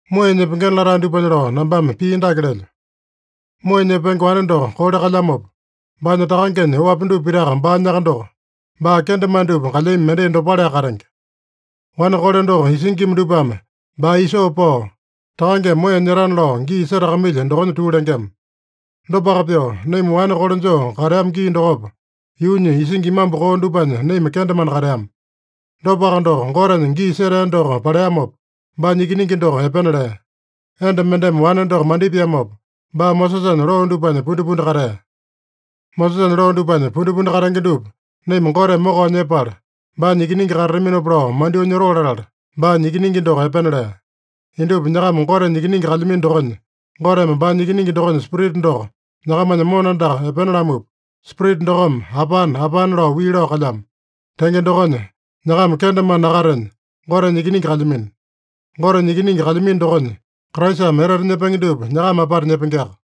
Moeya nyepengena latae dupanya lao nambame pii dake lelyo: Moeya nyepenge wane doko kole kalyamopa, baanya takangenya oapi dupa pitaka baanyaka doko, baa kendemane dupa kalyami mendai dopaleaka katenge. Wane kole doko isingima dupame baa isoo pao, takangeme moeya nyetana lao gii setakamailya dokonya tuu lengema. Dopaka pyoo, naima wane kole joo kateama gii dokopa, yuunya isingi imambu koo dupanya naima kendemane kateama. Dopaka doko, Gotenya gii setea doko paleamopa, baanya Ikiningi doko epena lea. Enda mendeme wane doko mandipiamopa, baa Mosesanya loo dupanya pundipundi katea. Mosesanya loo dupanya pundipundi katenge dupa naima Goteme mokao nyepala, baanya ikiningi katataminopa lao mandyoo nyotoo latala, baanya Ikiningi doko epena lea. Indupa nyakama Gotenya ikiningi kalyamino dokonya, Goteme baanya Ikiningi dokonya Spirita doko nyakamanya mona andaka epena lamupa, Spirita dokome, “Apane, Apane” lao wii lao kalyamo. Tenge dokonya, nyakama kendemane nakatenya, Gotenya ikiningi kalyamino. Gotenya ikiningi kalyamino dokonya, Kraisame etete nyepenge dupa nyakama apata nyepengeaka.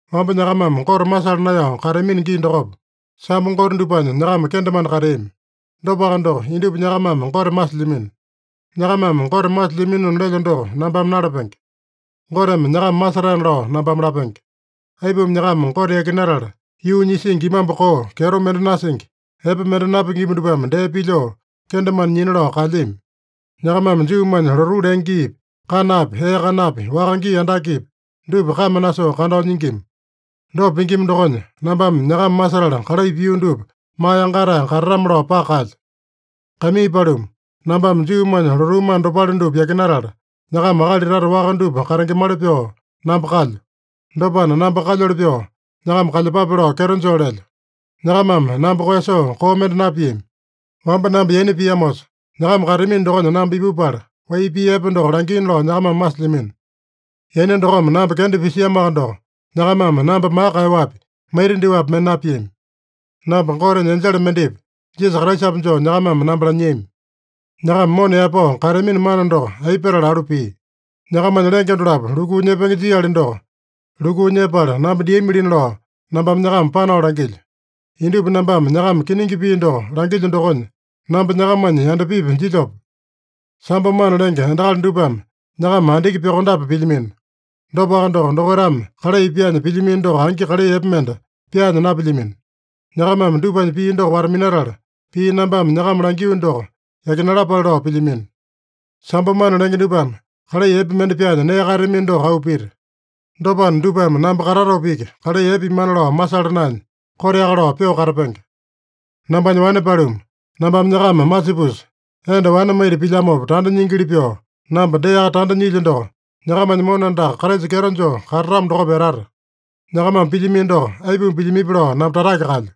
Wamba nyakamame Gote masala naeyao kateamino gii dokopa, sambo gote dupanya nyakama kendemane kateami. Dopaka doko, indupa nyakamame Gote masilyamino. Nyakamame Gote masilyaminona lelyo doko nambame nalapenge. Goteme nyakama masetaena lao nambame lapenge. Aipuma nyakama Gote yakinatala, yuunya isingi imambu koo, kyeto mende nasingi, epe mende napingima dupame dee pilyoo, kendemane nyina lao kaelyami? Nyakamame Juumanya lotuu lenge giipi, kanapi, ee kanapi, waka gii andakepi, dupa kame nasoo kandao nyingima. Dopa pingima dokonya, nambame nyakama masetala kalai pio dupa maa yangatae katatame-lao paka kaelyo. Kaimii paluma, nambame Juumanya lotuu mana dopale dupa yakinatala, nyakama akali tata waka dupa katengemali pyoo namba kalyo. Dopana, namba kalyoli pyoo nyakama kalyepape lao kyeto joo lelyo. Nyakamame namba koeyasoo koo mende napiami. Wamba namba yaina piamosa, nyakama kateamino dokonya namba ipupala, wai pii epe doko langiina lao nyakamame masilyamino. Yaina dokome namba kenda pisiamoaka doko, nyakamame namba maka kaeyaowapi, maita dyoapi mende napiami. Namba Gotenya enjele mendepi, Jisasa Kraisapi joo nyakamame namba lanyiami. Nyakama mona yaepao kateamino mana doko aipa petala alu pia? Nyakamanya lenge dolapo lukuu nyepenge jiali doko, lukuu nyepala namba diamilina lao nambame nyakama panao langilyo. Indupa nambame nyakama kiningi pii doko langilyo dokonya, namba nyakamanya yandapipi jilyope? Sambo mana lenge endakali dupame nyakama andiki pyokondape pilyamino. Dopaka doko, dokaitame kalai pyaanya pilyamino doko angi kalai epe mende pyaanya napilyamino. Nyakamame dupanya pii doko wata-minatala, pii nambame nyakama langio doko yakinalapale lao pilyamino. Sambo mana lenge dupame kalai epe mende pyaanya nee kaeyatamino doko auu pita. Dopana, dupame namba katatopa iki kalai epe pimana lao masala naenya, koteaka lao pyoo katapenge. Nambanya wane paluma, nambame nyakama masipusa, enda wane maita pilyamopa tanda nyingili pyoo, namba deaka tanda nyilyo doko nyakamanya mona andaka Kraisa kyeto joo katatamo dokopa etata. Nyakamame pilyamino doko, aipuma pilyamipi lao namba tatake kaelyo.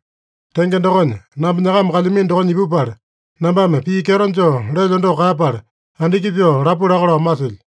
Tenge dokonya, namba nyakama kalyamino dokonya ipupala, nambame pii kyeto joo lelyo doko kaeyapala, andiki pyoo lapu laka lao masilyo.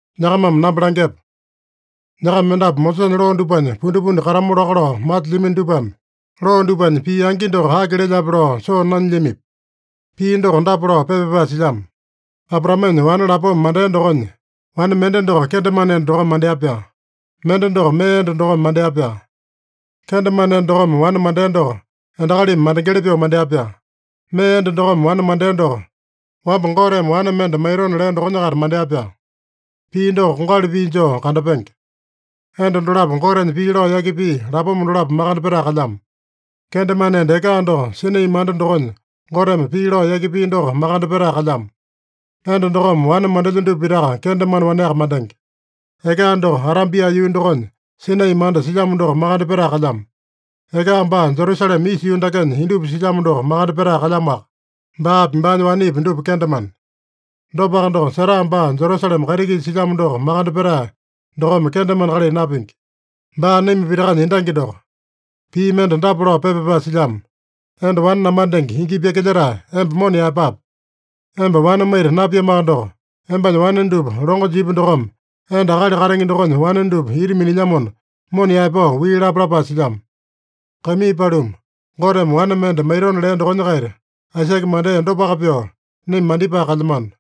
Nyakamame namba langyepa: Nyakama mendapu Mosesanya loo dupanya pundipundi katamu laka lao masilyamino dupame, loo dupanya pii angi doko aki lelyape lao soo nanyilyamipi? Pii doko dapa lao pepa pyapae silyamo: Abraamenya wane lapoma mandea dokonya, wane mende doko kendemane enda dokome mandea-pyaa. Mende doko mee enda dokome mandea-pyaa. Kendemane enda dokome wane mandea doko endakalimi mandengeli pyoo mandea-pyaa. Mee enda dokome wane mandea doko, wamba Goteme wane mende maitona lea dokonya-kaita mandea-pyaa. Pii doko kongali pii joo kandapenge. Enda dolapo Gotenya pii lao yaki pia lapoma dolapo makande petae kalyamo. Kendemane enda Eka doko Sinai manda dokonya Goteme pii lao yaki pia doko makande petae kalyamo. Enda dokome wane mandelya dupa pitaka kendemane waneaka mandenge. Eka doko Arabia yuu dokonya Sinai manda silyamo doko makande petae kalyamo. Eka baa Jerusalema isa yuu dakenya indupa silyamo doko makande petae kalyamoaka. Baapi, baanya wanepi dupa kendemane. Dopaka doko, Sara baa Jerusalema kaiti-kisa silyamo doko makande petae dokome kendemane kalai napingi. Baa naima pitakanya endangi doko. Pii mende dapa lao pepa pyapae silyamo: “Enda wane namandenge, ingi pyakilyetae, emba mona yaepape! Emba wane maita napiamoaka doko, embanya wane dupa longo jipya dokome, enda akali katenge dokonya wane dupa ita minilyamona, mona yaepao wii lape!” lapae silyamo. Kaimii paluma, Goteme wane mende maitona lea dokonya-kaita Aisake mandea dopaka pyoo, naima mandipae kalyamano.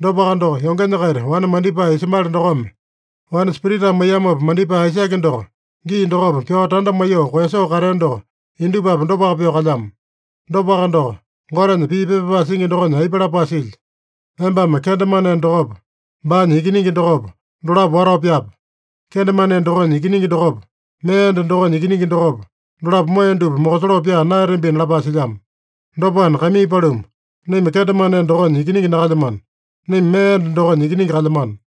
Dopaka doko, yongenya-kaita wane mandipae Ismaele dokome, wane Spiritame maiyamopa mandipae Aisake doko, gii dokopa pyao tanda maiyoo koeyasoo katea doko, indupapi dopaka pyoo kalyamo. Dopaka doko, Gotenya pii pepa pyapae singi dokonya aipa lapae silya? “Embame kendemane enda dokopa, baanya ikiningi dokopa, dolapo watao pyape. Kendemane enda dokonya ikiningi dokopa, mee enda dokonya ikiningi dokopa, dolapo moeya dupa mokosoloo pyaa naeyatambina” lapae silyamo. Dopana, kaimii paluma, naima kendemane enda dokonya ikiningi nakalyamano. Naima mee enda dokonya ikiningi kalyamano.